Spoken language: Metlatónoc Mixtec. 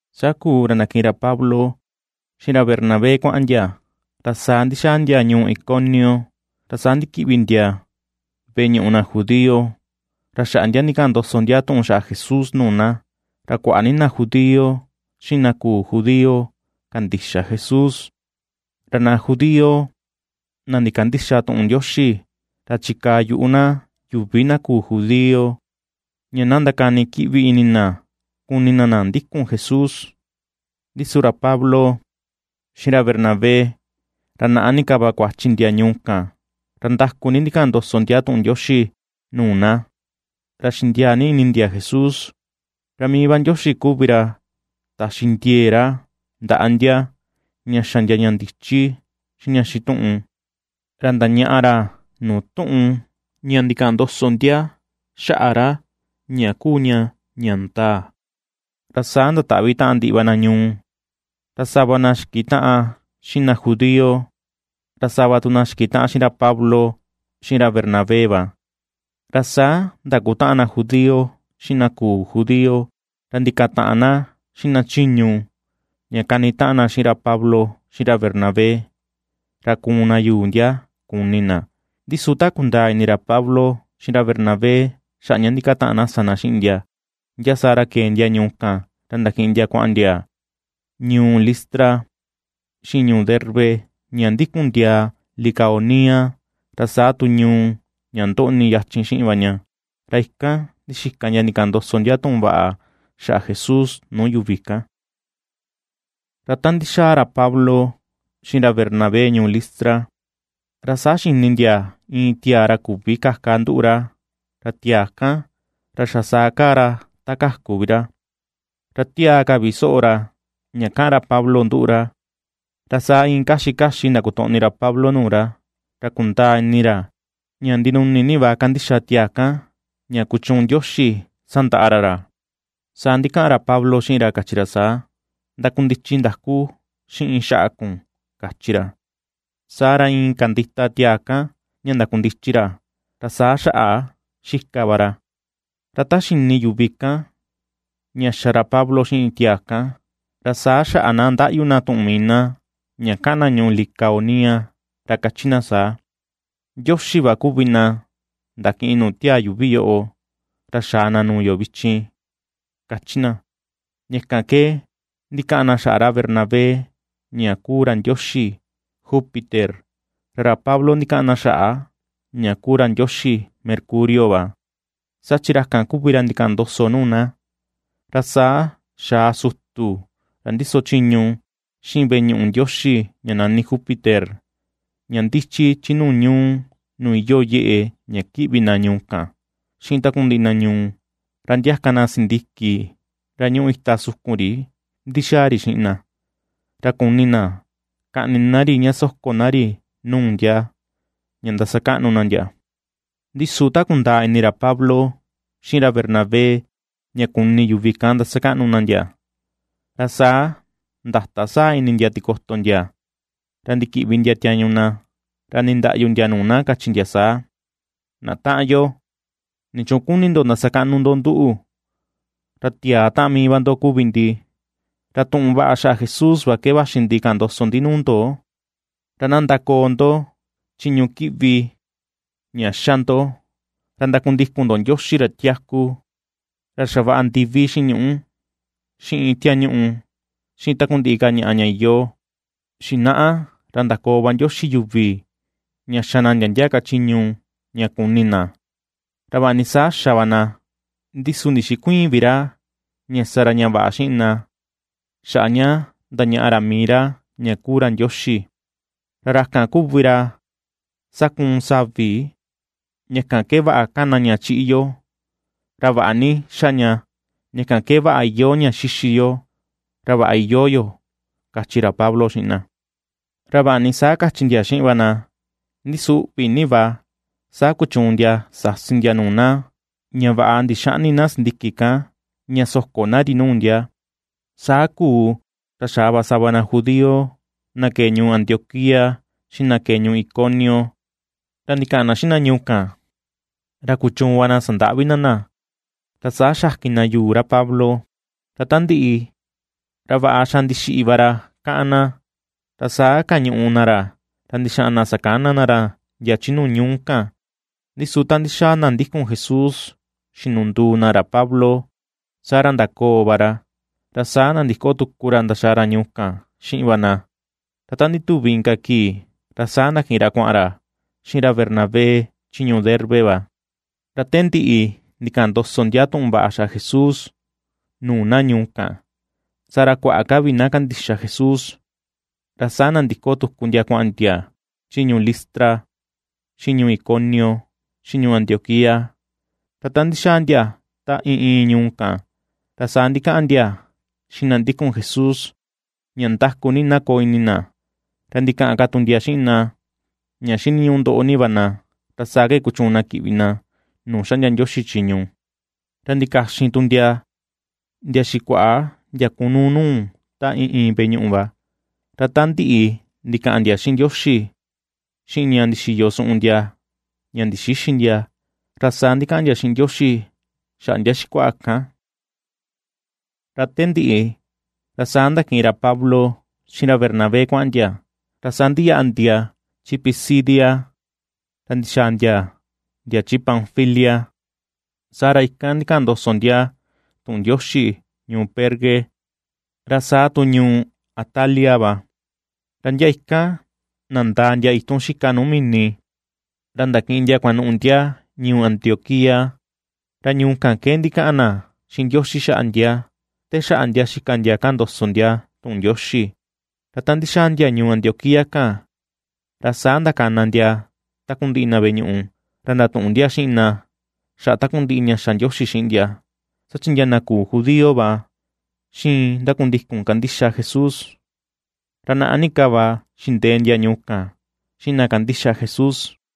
Saa kuu, ra ndakiꞌin ra Pablo xiꞌin ra Bernabé kuaꞌan ndia, ra saa ndixaa ndia ñuu Iconio, ra saa ndikiꞌvi ndia veꞌe ñuꞌu na judío, ra xaꞌa ndia ndikaꞌan ndoso ndia tuꞌun xaꞌa Jesús nuu na. Ra kuaꞌa ni na judío xiꞌin na küu judío kandixa Jesús. Ra na judío na ndikandïxa tuꞌun Ndioxi ra chikaa yuꞌu na yuvi na küu judío, ña na ndakani kiꞌvi ini na kuni na na ndikun Jesús. Ndi su ra Pablo xiꞌin ra Bernabé, ra naꞌa ni ka va kuachi ndia ñuu kan, ra ndaku ni ndikaꞌan ndoso ndia tuꞌun Ndioxi nuu na, ra xindiaa ni ini ndia Jesús. Ra mii Ndioxi kuvi ra taxi ra ndiee ndaꞌa ndia ña xa ndia ña ndichi xiꞌin ña xituꞌun, ra ndañaꞌa ra nuu tuꞌun ña ndikaꞌan ndoso ndia xaꞌa ra ña kuu ña ña ndaa. Ra saa ndataꞌvi taꞌan ndiꞌi va na ñuu, ra sava na xikitaꞌan xiꞌin na judío, ra sava tu na xikitaꞌan xiꞌin ra Pablo, xiꞌin ra Bernabé va. Ra saa ndakutaꞌan na judío xiꞌin na küu judío, ra ndikataꞌan na xiꞌin na chiñu, ña kanitaꞌan na xiꞌin ra Pablo xiꞌin ra Bernabé, ra kuun na yuu ndia, kuni na. Ndi su ta kundaa ini ra Pablo xiꞌin ra Bernabé xaꞌa ña ndikataꞌan na sa na xiꞌin ndia, ndia saa ra kee ndia ñuu kan, ra ndakiꞌin ndia kuaꞌan ndia ñuu Listra xiꞌin ñuu Derbe, ña ndikun ndiaa Licaonia, ra saa tu ñuu ña ndoꞌni yachin xiꞌin va ña. Ra ikan ndixika ndia ndikaꞌan ndoso ndia tuꞌun vaꞌa xaꞌa Jesús nuu yuvi kan. Ra ta ndixaa ra Pablo xiꞌin ra Bernabé ñuu Listra, ra saa xini ndia iin tiaa ra küvi kaka nduꞌu ra, ra tiaa kan, ra xa saa kaa ra ta kaku vi ra. Ra tiaa ka vi soꞌo ra ña kaꞌan ra Pablo nduꞌu ra, ra saa iin kaxi kaxi ndakotoꞌni ra Pablo nuu ra, ra kundaa ini ra ña ndinuni ni va kandixa tiaa kan, ña kuchuun Ndioxi sandaꞌa ra ra. Saa ndikaꞌan ra Pablo xiꞌin ra, kachi ra saa: ―Ndakundichi ndaku xiꞌin xaꞌa kun ―kachi ra. Saa ra iin kandita tiaa kan ña ndakundichi ra, ra saa xaꞌa xika va ra. Ra ta xini yuvi kan, ña xa ra Pablo xiꞌin tiaa kan, ra saa xaꞌa na ndaꞌyu tuꞌun mii na, ña kaꞌan na ñuu Licaonia, ra kachi na saa: ―¡Ndioxi va kuvi na ndakiꞌin nuu tiaa yuuvi yoꞌo, ra xaa na nuu yo vichin! ―kachi na. Ña kan ke ndikaꞌan na xaꞌa ra Bernabé ña kuu ra ndioxi Júpiter, ra ra Pablo ndikaꞌan na xaꞌa ña kuu ra ndioxi Mercurio va, saa chi ra kan kuvi ra ndikaꞌan ndoso nuu na. Ra saa xaa sutu ra ndiso chiñu xiꞌin veꞌe ñuꞌu ndioxi ña nani Júpiter, ña ndichi chi nuu ñuu, nuu iyoo yeꞌe ña kiꞌvi na ñuu kan, xiꞌin takundiꞌi na ñuu, ra ndiaka na sindiki ra ñuꞌu ita siki sukun ri ndixaa ri xiꞌin na, ra kuni na kaꞌni na ri ña soko na ri nuu ndia, ña ndasakaꞌnu na ndia. Ndi su ta kundaa ini ra Pablo xiꞌin ra Bernabé, ña kuni yuvi kan ndasakaꞌnu na ndia. ra saa ndata saa ini ndia tikoto ndia, ra ndikiꞌvi ndia tiañu na, ra ndindaꞌyu ndia nuu na, kachi ndia saa: ―¡Na taꞌan yo! ¿Nichuun kuni ndo ndasakaꞌnu ndo nduꞌu? Ra tiaa taꞌan mii va ndo kuvi ndi. Ra tuꞌun vaꞌa xaꞌa Jesús va ke vaxi ndi kaꞌan ndoso ndi nuu ndo, ra na ndakoo ndo chiñu kiꞌvi ña xa ndo, ra ndakundiko ndo Ndioxi ra tiaku, ra xavaꞌa ndivi xiꞌin ñuꞌu, xiꞌin tiañuꞌu, xiꞌin takundiꞌi ka ñaꞌa ña iyoo. Xinaꞌa ra ndakoo va Ndioxi yuvi ña xa na ndia ndia ka chiñu ña kuni na. Ra vaꞌa ni saa xa va na, ndi su ndixikuïin vi ra ña sa ra ña vaꞌa xiꞌin na xaꞌa ña ndañaꞌa ra mii ra ña kuu ra Ndioxi. Ra ra kan kuvi ra sakuun savi ña kan ke vaꞌa kana ña chiꞌi yo, ra vaꞌa ni xa ña, ña kan ke vaꞌa iyoo ña xixi yo, ra vaꞌa iyoo yo ―kachi ra Pablo xiꞌin na. Ra vaꞌa ni saa kachi ndia xiꞌin va na, ndi su uꞌvi na va saa kuchuun ndia sasi ndia nuu na ña vaꞌa ndixäꞌni na sindiki kan, ña soko na ri nuu ndia. Saa kuu, ra xaa va sava na judío, na kee ñuu Antioquía xiꞌin na kee ñuu Iconio, ra ndikaꞌan na xiꞌin na ñuu kan, ra kuchuun va sandaꞌvi na na, ra saa xakin na yuu ra Pablo. Ra ta ndiꞌi, ra vaꞌa xa ndixiꞌi va ra káꞌan na, ra saa kañuꞌu na ra, ra ndixaꞌan na sakana na ra ndia chi nuu ñuu kan. Ndi su ta ndixaa na ndikun Jesús xinunduu na ra Pablo, saa ra ndakoo va ra, ra saa nandiko tuku ra ndaxaa ra ñuu kan xiꞌin va na; Ra ta ndituvi inka kii, ra saa ndakiꞌin ra kuaꞌan ra xiꞌin ra Bernabé chi ñuu Derbe va. Ra te ndiꞌi, ndikaꞌan ndoso ndia tuꞌun vaꞌa xaꞌa Jesús nuu na ñuu kan. Saa ra kuaꞌa ka vi na kandixa Jesús, ra saa nandiko tuku ndia kuaꞌan ndia chi ñuu Listra, xiꞌin ñuu Iconio, xiꞌin ñuu Antioquía. Ra ta ndixaa ndia ta iin iin ñuu kan, ra saa ndikaꞌan ndia xiꞌin na ndikun Jesús ña ndaku ni na koo ini na, ra ndikaꞌan ka tu ndia xiꞌin na, ña xiniñuꞌu ndoꞌo ni va na, ra saa ke kuchuun na kiꞌvi na nuu xaꞌndia Ndioxi chiñu. Ra ndikaxin tu ndia, ndia xikuaꞌa ndia kunuu nuu ta iin iin veꞌe ñuꞌu va, ra ta ndiꞌi ndikaꞌan ndia xiꞌin Ndioxi, xiꞌin ña ndixiyo suꞌun ndia, ña ndixïxi ndia, ra saa ndikaꞌan ndia xiꞌin Ndioxi xaꞌa ndia xikuaꞌa kan. Ra te ndiꞌi, ra saa ndakiꞌin ra Pablo xiꞌin ra Bernabé kuaꞌan ndia, ra saa ndiyaꞌa ndia chi Pisidia, ra ndixaa ndia ndia chi Panfilia. Saa ra ikan ndikaꞌan ndoso ndia tuꞌun Ndioxi ñuu Perge, ra saa tu ñuu Atalia va. Ra ndia ikan nandaa ndia itun xika nuu mini, ra ndakiꞌin ndia kuanuꞌu ndia ñuu Antioquía, ra ñuu kan ke ndikaꞌan na xiꞌin Ndioxi xaꞌa ndia, te xaꞌa ndia xika ndia kaꞌan ndoso ndia tuꞌun Ndioxi. Ra ta ndixaa ndia ñuu Antioquía kan, ra saa ndakana ndia takundiꞌi na veꞌe ñuꞌu, ra ndatuꞌun ndia xiꞌin na xaꞌa takundiꞌi ña xa Ndioxi xiꞌin ndia, saa chi ndia na küu judío va xiin ndakundikun kandixa Jesús. Ra naꞌa ni ka va xindee ndia ñuu kan, xiꞌin na kandixa Jesús.